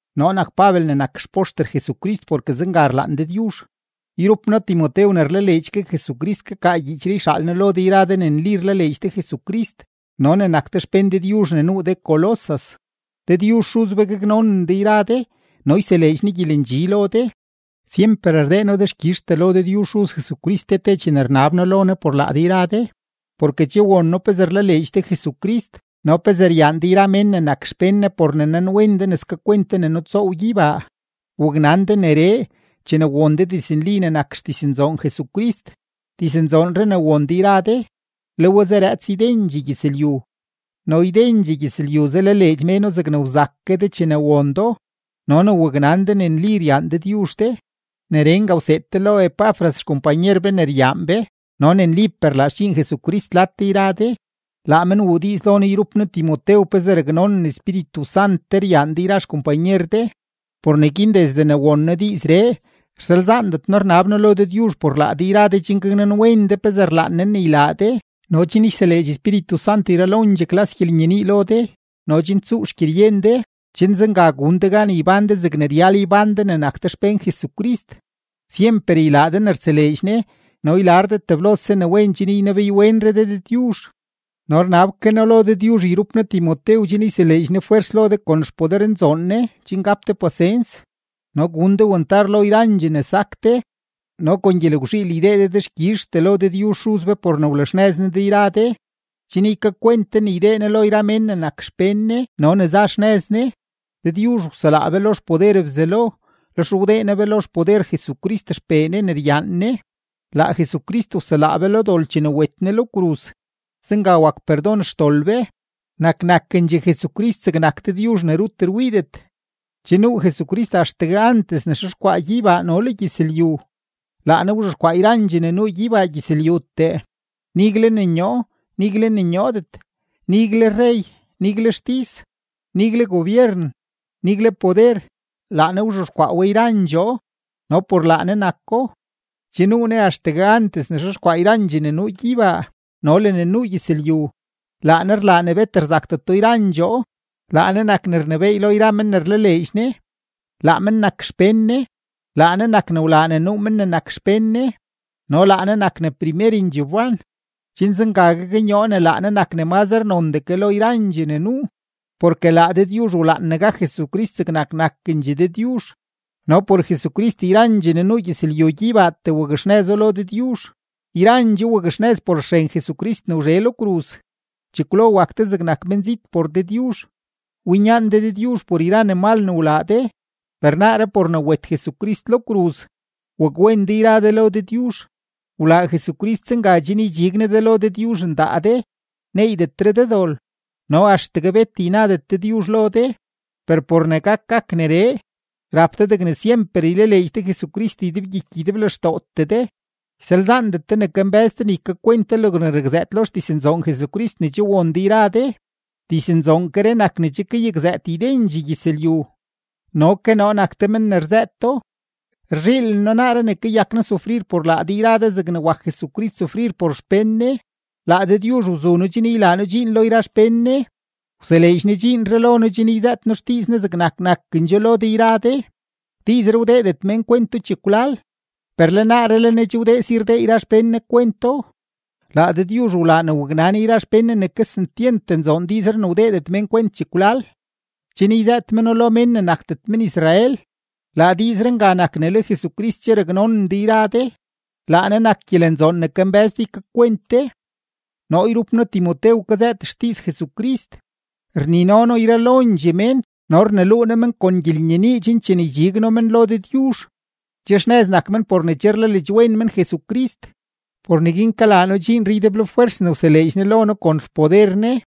Noo nak Pabel ne nak xpoxter Jesucrist porke zenga rlaan Dëdyuzh. Yrup noo Timotew ne rlaleedx ke Jesucrist kakaa gyiichree yxaal noo lo de yra de ne nli rlaleedx de Jesucrist no ne nak de xpén Dëdyuzh ne nuu de Colosas. Dëdyuzh Xuz be gaknonen de yra de no yseleedx Ne gyelendxi lo de. Syemper rdee noo dexkyizhtee lo Dëdyuzh Xuz Jesucrist te te chene rnab noo lo Ne por laa de yra de, porke che won noo pezee rlaleedx de Jesucrist no pezee ryaan de yra mén ne nak xpén Ne por ne nanwen de ne skakwent de ne nutsoow gyeybaa. Waknan de neree, chene won de diznli ne nak xdiznzoon Jesucrist. Diznzoonree ne won de yra de, le we zarëëts ydendxee gyëzlyu no ydendxee gyëzlyu zalaleedx méno zegne wzak ke de chene won do no ne waknan de ne nli ryaan Dëdyuzh de. Neree nga wseed de lo Epafras xkompanyer be ne ryaan be no ne nlipee rlaa xdxiin Jesucrist lad de yra de. Laa men wuu diiz lo noo yrup noo Timotew pezee raknonen Espíritu Sant de ryaan de yra xkompanyer de. Por neguin desde ne won noo diizree, rsalzaandet noo rnab noo lo Dëdyuzh por laa de yra de chen gaknanwen de pezee rlaan Ne ne ylaa de no chen yseleedx Espíritu Sant yralondxee klas gyelenyenii lo de no chen tsuu xgyeryen de, chen zenga gun de gan ybán de zegne ryal ybán de ne nak de xpén Jesucrist, syemper ylaa de ne rtseleedx Ne no ylar de teblose ne wen chen ynebeeyre de Dëdyuzh. No rnab ke noo lo Dëdyuzh yrup noo Timotew chen yseleedx Ne fwers lo de kon xpodernzoon Ne chen gap de pasens no gun de wantar lo yrandxee ne sak de no kon gyelgwzhiil ydee de dexkyizhtee lo Dëdyuzh Xuz be por ne wlaxnëz Ne de yra de, chen ykakwent de ne ydee Ne lo yra mén ne nak xpén Ne no ne za xnëz Ne. Dëdyuzh wselaa be lo xpoder Bzelo, lex wdee Ne be lo xpoder Jesucrist XPee Ne ne ryaan Ne; laa Jesucrist wselaa be lo dol chene wet Ne lo kruz; zenga wak perdon xdol be. Nak nakendxegue Jesucrist zegnak Dëdyuzh ne rut rwiidet, che nuu Jesucrist axtegue antes ne xexkwaa gyeybaa no le gyëzlyu. Laa Ne wzhexkwaa yrandxee ne nuu gyeybaa gyëzlyutee, nigle ne nyoo, nigle ne nyoodet, nigle rrey, nigle xtis, nigle gobyeren, nigle poder. Laa Ne wzhexkwaa we yrandxoo no por laa Ne nako. Che nuu Ne axtegue antes ne xexkwaa yrandxee ne nuu gyeybaa no le ne nuu gyëzlyu; laa Ne rlaa ne bet rzakdeto yrandxoo. Laa Ne nak ne rnebééy lo yra men ne rlaleedx Ne; laa men nak xpén Ne. Laa Ne nak ne wlaa ne nuu men ne nak xpén Ne no laa Ne nak ne primerendxee wban, chen zenga gaknyoo ne laa Ne nak ne mazre nondee ke lo yrandxee ne nuu. Porke laa Dëdyuzh wlaan ne gak Jesucrist zegnak nakendxegue Dëdyuzh no por Jesucrist yrandxee ne nuu gyëzlyu gyeybaatee wakxnëzo lo Dëdyuzh; yrandxoo wakxnëz por xren Jesucrist ne wzhe lo kruz. Chekwlo wak de zegnak menzit por Dëdyuzh, winyaan de Dëdyuzh por yra ne mal ne wlaa de. Per naaree por ne wet Jesucrist lo kruz, wakwen de yra de lo Dëdyuzh; wlaa Jesucrist zenga chen ydxig Ne de lo Dëdyuzh ndaa de, neeydetre de dol, no axtegue bet ynadet Dëdyuzh lo de. Per por ne gak gak neree, rap de degne syemper ylaleedx de Jesucrist ydebgyiky ydeblextootee de, ysalzaandet de ne kambë́z de ne ykakwent de logne rakzëët lo xdiznzoon Jesucrist ne che won de yra de. Diznzoonkeree nak ne che kayakzëët ydendxee gyëzlyu, no ke noo nak te men ne rzëëto. Rzhiilen noo naaree ne kayak noo sufrir por laa de yra de zegne wak Jesucrist sufrir por xpén Ne. Laa Dëdyuzh wzu noo chen ylaa noo dxiin lo yra xpén Ne; wseleedx Ne dxiinree lo noo chen yzëët noo xdiiz Ne zegnak nakendxoo lo de yra de. Diizree wdeedet mén kwento chekwlal, per le naaree le Ne che wdee si rdee yra xpén Ne kwento. Laa Dëdyuzh wlaa ne waknan yra xpén Ne ne kesentyent nzoon diizree ne wdeedet mén kwent chekwlal, chen yzëët meno lo mén ne nakdet men-Israel; laa diizree nga nak ne le Jesucrist che raknonen de yra de, laa Ne nak gyelenzoon ne kambë́z de ykakwent de. Noo yrup noo Timotew kazëët xdiiz Jesucrist, rnino noo yralondxee mén no rneluu noo men kon gyelenyenii chen chene ydxig noo men lo Dëdyuzh, che xnëz nak men por ne che rlaleedxwen men Jesucrist. Por neguin kalaa noo dxiinree ydeblofwers ne wseleedx Ne lo noo kon xpoder Ne.